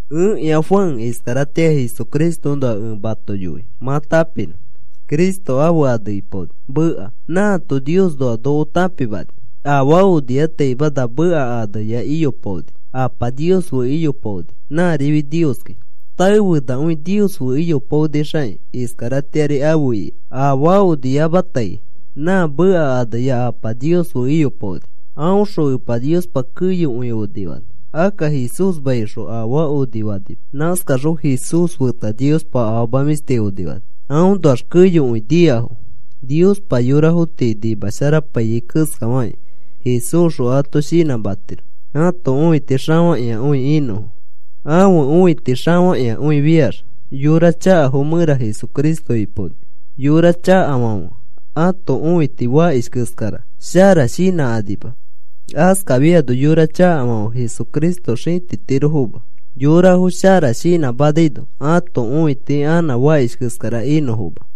(Ẽkĩa Juan. Iskaratĩa Jesucristoõnoa ẽ mato yoi mã tãpinõ. Cristo ãfe ane ipaoni, Meka. Nãato Niosnoa noko tãpimani.) Afaa oniataima na Meka aneya iyopaoni. Apa Nios fe iyopaoni. Nãrifi Nioski. Taefenakõi Nios fe iyopaonixakĩ, iskaratĩari afe ika. Afaa oniamatai nã Meka aneya Apa Nios fe iyopaoni. Aõxõ Epa Niospa keyokõi onifani. Akka Jesúsmaisxõ afaa onifanima. Nãskaxõ Jesús feta Niospa afama mĩshti onifani. Aõnoax keyokõi niafo. Niospa yorafo tii shinãmapaiyai keskafakĩ Jesúsxõ ato shinãmatiro ãto õiti xafakĩakõi inõfo. Ãfe õiti xafakĩakõifiax yora chakafo mẽra Jesucristo ipaoni. Yora chakafãfe ãto õiti fakish keskara, shara shinãkanima. Askafiano yora chakafãfe Jesucristo xĩtitirofoma yorafo shara shinãmanaino ãto õiti anã fakish keskara inõfoma.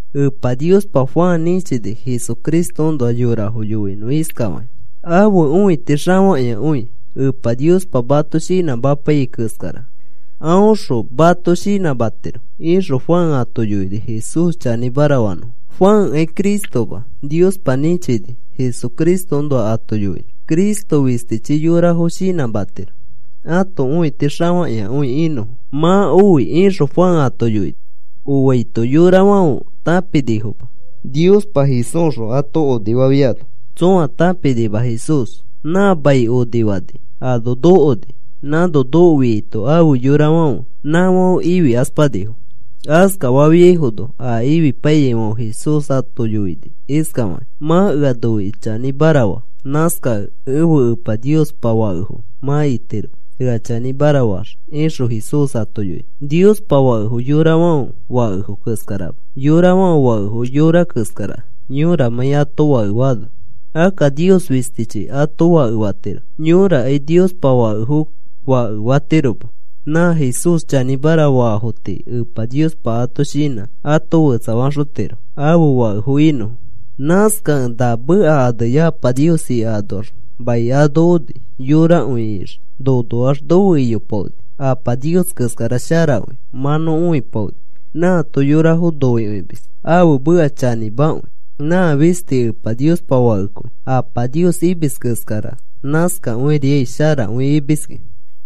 Epa Niospa Juan nĩchini Jesucristoõnoa yorafo yoinõ iskafakĩ: “Ãfe õiti xafakĩakõi. Epa Niospa mato shinãmapaiyai keskara aõxõ mato shinãmatiro,” ixõ Juan ato yoini Jesús chanĩmara fanõfo. Juankai Cristoma, Niospa nĩchini Jesucristoõnoa ato yoinõ. Cristo fistichi yorafo shinãmatiro ãto õiti xafakĩakõi inõfo. “Mã oi,” ixõ Juan ato yoini. Oaito yorafãfe tãpinifoma. Niospa Jesúsxõ ato onifafiano tsõa tãpinima Jesús. Nã mai onifani ano nokoni. Nãno nokofiaito ãfe yorafãfe, nãfãfe ifikaspanifo. Askafafiaifono a ifipaiyaifãfe Jesús ato yoini iskafakĩ: “Mã ea noikĩ chanĩmara faa. Nãskakẽ ẽfe Epa Niospa fakefo mã itiro ea chanĩmara faax,” ixõ Jesús ato yoini. Niospa fakefo yorafãfe fakefo keskarama. Yorafãfe fakefo yora keskara, yõramãi ato fake faano. Akka Nios fistichi ato fake fatiro. Yõrakai Niospa fakefo fake fatiroma. Nã Jesús chanĩmara faafo tii Epa Niospa ãto shinã ato fetsafaxotiro ãfe fakefo inõfo. Nãskakẽ na Meka aneya Apa Nios ika anoax mai ano oni yorakõi ixikĩ. Nonoax nofe iyopaoni. Apa Nios keskara sharakõi mã nõ õipaoni. Nãato yorafo noikõimis. Ãfe meka chanĩmakõi. Nã fisti Epa Niospa Fakekõi. Apa Nios imis keskara nãskakõiriai sharakõi imiski.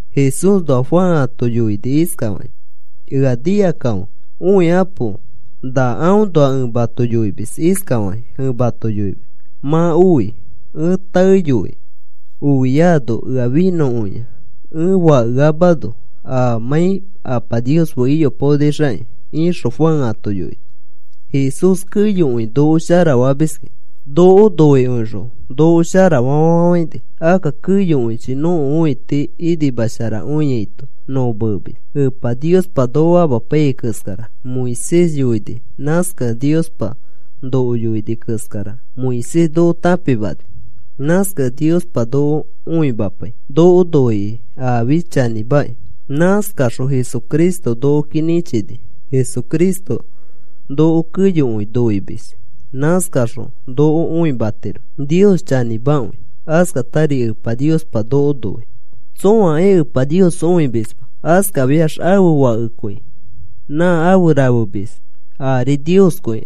Jesúsnoa Juan ato yoini iskafakĩ: “Ea nikakãfe, õikapo. Nãõnoa ẽ mato yoimis. Iskafakĩ ẽ mato yoimis: ‘Mã oi. Ẽ taeyoi ofiano ea finõkõia ẽ fakeamano amãi Apa Nios fe iyopaonixakĩ,’” ixõ Juan ato yoini. Jesús keyokõi noko shara famiski. Noko noikõixõ noko sharafa fafafãini. Akka keyokõichi nõko õiti inimasharakõiaito nõ meemis. Epa Niospa noko amapaiyai keskara Moisés yoini. Nãskakẽ Niospa noko yoini keskara Moisés noko tãpimani. Nãskakẽ Niospa noko õimapai noko noikõi afi chanĩmakĩ. Nãskaxõ Jesucristo nokoki nĩchini. Jesucristo noko keyokõi noimis. Nãskaxõ noko õimatiro Nios chanĩmakõi. Askatari Epa Niospa noko noi. Tsõakai Epa Nios õimisma. Askafiax ãfe Fakekõi nã afe rafemis, arifi Nioskõi.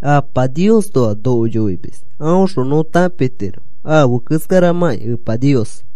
Apa Niosnoa noko yoimis. Aõxõ nõ tãpitiro afe keskaramãki Epa Nios.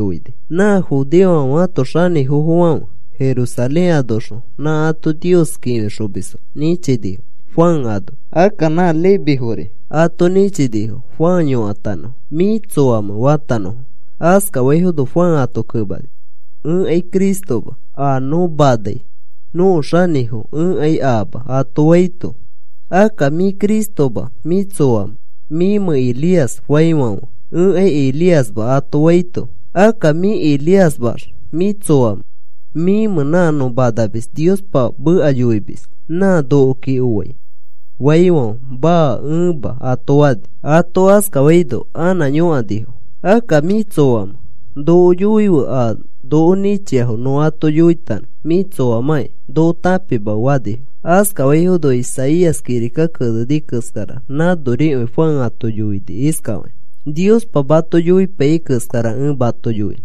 Nã judeofãfe ãto xanĩfofãfe Jerusalén anoxõ nã ato Nios kĩfixomisfo nĩchinifo, Juan ano. Akka nã Levifori ato nĩchinifo Juan yõkatanõfo: “¿Mĩ tsoamẽ?” fatanõfo. Askafaifono Juan ato kemani: “Ẽkai Cristoma. A nõ manai nõko xanĩfo ẽkai aama,” ato faito, “¿Akka mĩ Cristoma, mĩ tsoamẽ? ¿Mĩmẽ Elías?” faifãfe, “Ẽkai Elíasma,” ato faito, “¿Akka mĩ Elíasmaax mĩ tsoamẽ? ¿Mĩmẽ nã nõ manamis Niospa meka yoimis, nã nokoki oai?” faifãfe, “Maa, ẽma,” ato fani. Ato askafaino anã yõkanifo: “¿Akka mĩ tsoamẽ? Noko yoife a noko nĩchiafo nõ ato yoitanõ. Mĩ tsoamãki noko tãpimafe,” fanifo. Askafaifono Isaías kirika keneni keskara nãnorikõi Juan ato yoini iskafakĩ: “Niospa mato yoipaiyai keskara ẽ mato yoinõ.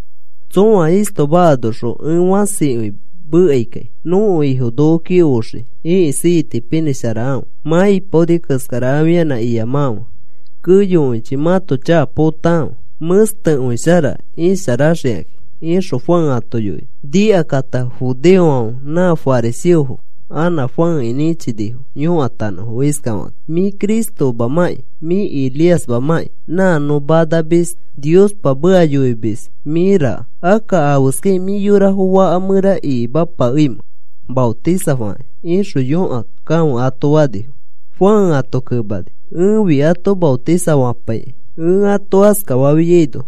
Tsõa istoma anoxõ ẽ fãsikõi mekaikai: ‘Nõko Ifo nokoki oxii. Ĩkisi itipinĩsharakãfe. Mã ipaoni keskara afianã iyamakãfe. Keyokõichi mãto chaka potakãfe, mẽstekõishara isharaxikakĩ,’” ixõ Juan ato yoini. Nikakata judeofãfe nã fariseofo a Juanki nĩchinifo yõkatanõfo iskafakakĩ: “Mĩ Cristomamamãki, mĩ Elíasmamamãki nã nõ manamis Niospa meka yoimis mĩmaraka, akka, ¿afeskakĩ mĩ yorafo faka mẽra ikimapakeimẽ maotisafakĩ?” ixõ yõkakãfe ato fanifo. Juan ato kemani: “Ẽfi ato maotisafapaikai. Ẽ ato askafafiaino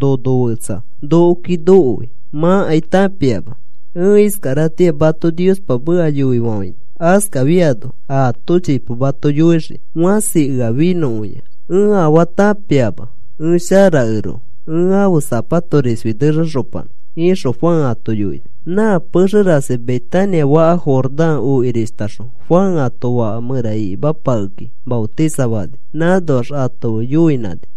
nono fetsa nokoki nokoi. Mãkai tãpiama. Ẽ iskaratĩa mato Niospa meka yoifafãini. Askafiano aato chipo mato yoixii. Fãsi ea finõkõia. Ẽ afaa tãpiama ẽ sharakeroko ẽ ãfe zapato risfi nexaxopanã,” ixõ Juan ato yoini. Nã pexe rasi Betania faka Jordán okirishtaxõ Juan ato faka mẽra ikimapakekĩ maotisafani. Nãnoax ato fe yoinãni.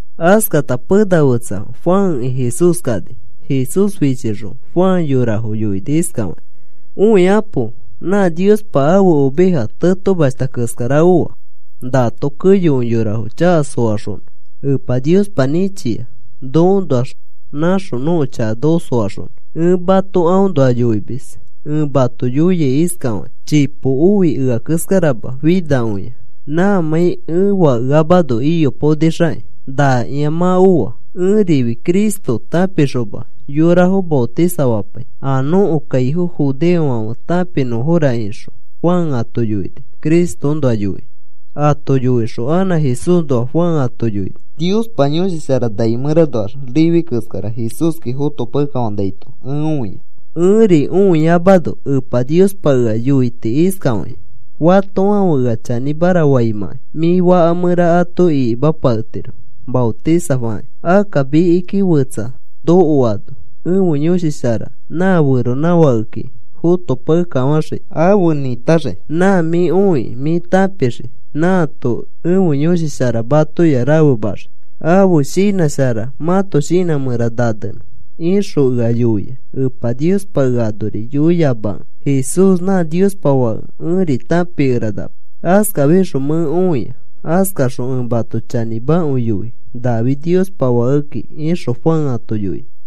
Askata pena fetsa Juanki Jesús kani. Jesús fichixõ Juan yorafo yoini iskafakĩ: “Õikapo. Nã Niospa ãfe oveja tetomashta keskara oa. Nato keyokõi yorafo chaka soaxonõ Epa Niospa nĩchia nokoõnoax naxõ nõko chaka noko soaxonõ. Ẽ mato aõnoa yoimis. Ẽ mato yoia iskafakĩ: ‘Chipo oi ea keskarama finakõia, nãmãi ẽ fakeamano iyopaonixakĩ.’ Nakĩa mã oa. Ẽrifi Cristo tãpixoma yorafo maotisafapai a nõko kaifo judeofãfe tãpinõfora,” ixõ Juan ato yoini Cristoõnoa yoikĩ. Ato yoixõ anã Jesúsnoa Juan ato yoini: “Niospa Yõshi Shara nai mẽranoax rifi keskara Jesúski fotopakekafanaito ẽ õia. Ẽri õiyamano Epa Niospa ea yoiti iskafakĩ: ‘Fatofãfe ea chanĩmara faimãkai mĩ faka mẽra ato ikimapaketiro maotisafakĩ. Akka mikiki fetsa nokoano ẽfe Yõshi Shara nã feronãfakeki fotopakekafãxii. Afe nĩtaxii. Nã mĩ õikĩ mĩ tãpixii nãato ẽfe Yõshi Shara matoya rafemaxii ãfe shinã shara mãto shinã mẽra nanenõ,’ ixõ ea yoia. Epa Niospa ea anori yoiyamakẽ Jesús nã Niospa Fake ẽri tãpikeranama. Askafixõ mẽ õia. Askaxõ ẽ mato chanĩmakõi yoi nafi Niospa Fakeki,” ixõ Juan ato yoini.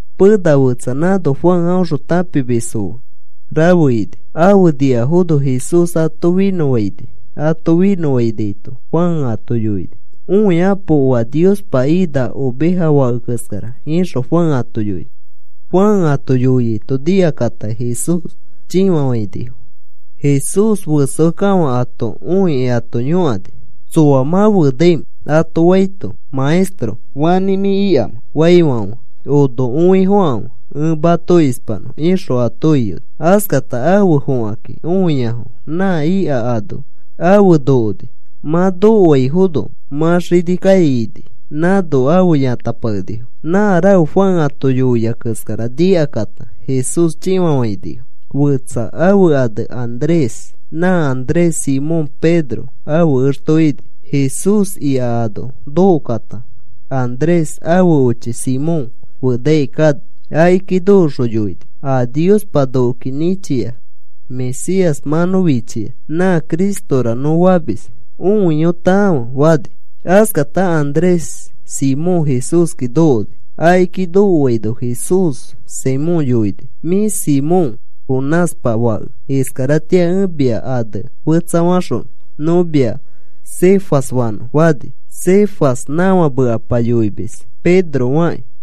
Pena fetsa nãno Juan aõxõ tãpimisfo rafe ini. Afe niafono Jesús ato finõfaini. Ato finõfainaito Juan ato yoini: “Õikapo. Oa Niospa ina oveja fake keskara,” ixõ Juan ato yoini. Juan ato yoiaito nikakata Jesús chĩfafãinifo. Jesús ifiakekafã ato õikĩ ato yõkani: “¿Tsoa mã fenaimẽ?” ato faito, “Maestro, ¿fanĩ mĩ ikamẽ?” faifãfe, “Ono õifokãfe, ẽ mato ispanõ,” ixõ ato iyoni. Askata afe fokakĩ õiafo nã ika ano afe nokoni. Mã nokoaifono mã xini kai ini. Nãno afe yãtapakenifo. Nã rafe Juan ato yoia keskara nikakata Jesús chĩfafainifo. Fetsa ãfe ane Andrés. Nã Andrés Simón Pedro ãfe exto ini. Jesús ika ano nokokata Andrés ãfe ochi Simón fenaikai kani. Akiki nokoxõ yoini: “A Niospa nokoki nĩchia Mesías mã nõ fichia. Nã Cristora nõ famis. Õiyotãfe,” fani. Askata Andrés Simón Jesúski nokokini. Akiki nokoaino Jesús Simón yoini: “Mĩ Simón, Jonáspa fake. Iskaratĩa ẽ mia ane fetsafaxonõ. Nõ mia Cefas fanõ,” fani. (Cefas nãfa mekapa yoimis Pedro fakĩ.)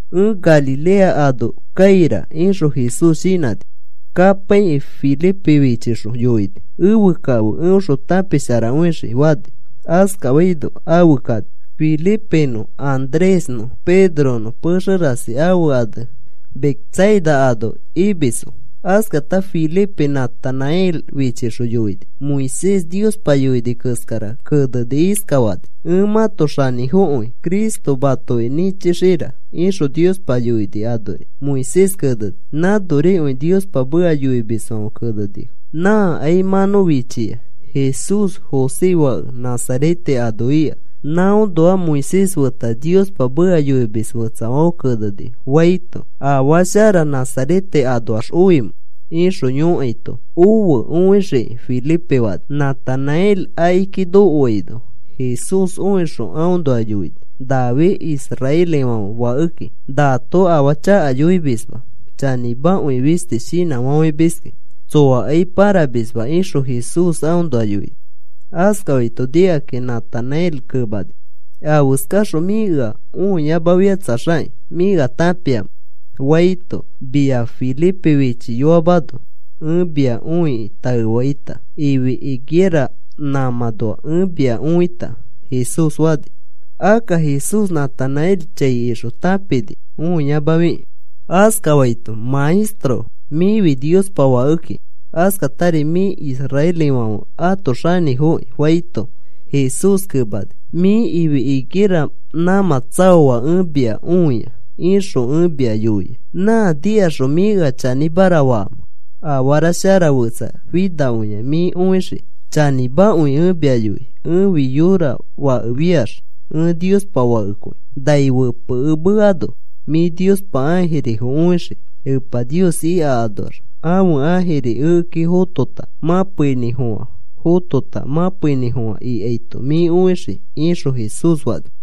“Ẽ Galilea ano kaira,” ixõ Jesús shinãni. Kapaikĩ Felipe fichixõ yoini: “Efe kafe, eõxõ tãpisharakõixikĩ,” fani. Askafaino afe kani. Felipenõ Andrésnõ Pedronõ pexe rasi ãfe ane Betsaida ano imisfo. Askata Felipe Natanael fichixõ yoini: “Moisés Niospa yoini keskara kenekĩ iskafani: ‘Ẽ mãto xanĩfokõi Cristo matoki nĩchixira,’ ixõ Niospa yoini anori Moisés keneni. Nãnorikõi Niospa meka yoimisfãfe kenenifo. Nãkai mã nõ fichia. Jesús José fake Nazarete ano ika. Nãõnoa Moisés feta Niospa meka yoimis fetsafãfe kenenifo,” faito, “¿Afaa shara Nazarete anoax oimẽ?” ixõ yõkaito, “Ofe, õixikĩ,” Felipe fani. Natanael akiki nokoaino Jesús õixõ aõnoa yoini: “Nafi israelifãfe fakeki. Nato afaa chaka yoimisma. Chanĩmakõi fisti shinãfafãimiskĩ. Tsoakai pãramisma,” ixõ Jesús aõnoa yoini. Askafaito nikakĩ Natanael kemani: “¿Afeskaxõ mĩ ea õiyamafikatsaxakĩ mĩ ea tãpiamẽ?” faito, “Mia Felipe fichiyoamano ẽ mia õikĩ taefaita ifi higuera nãmãnoa ẽ mia õita,” Jesús fani. (Akka Jesús Natanael chai ixõ tãpini õiyamafikĩ.) Askafaito, “Maestro, mĩfi Niospa fakeki. Askatari mĩfi israelifãfe ãto xanĩfokĩ,” faito, Jesús kemani: “ ‘Mĩ ifi higuera nãmã tsaoa ẽ mia õia,’ ixõ ẽ mia yoia, ¿nã nikaxõ mĩ ea chanĩmara faamẽ? Afara shara fetsa finakõia mĩ õixii. Chanĩmakõi ẽ mia yoi. Ẽfi yõra fakefiax ẽ Niospa Fakekõi. Nai fepekemeano mĩ Niospa ãjirifo õixii. Epa Nios ika anoax ãfe ãjiri ekeki fotota, mãpeinĩfofã fotota, mãpeinĩfofã ikaito mĩ õixii,” ixõ Jesús fani.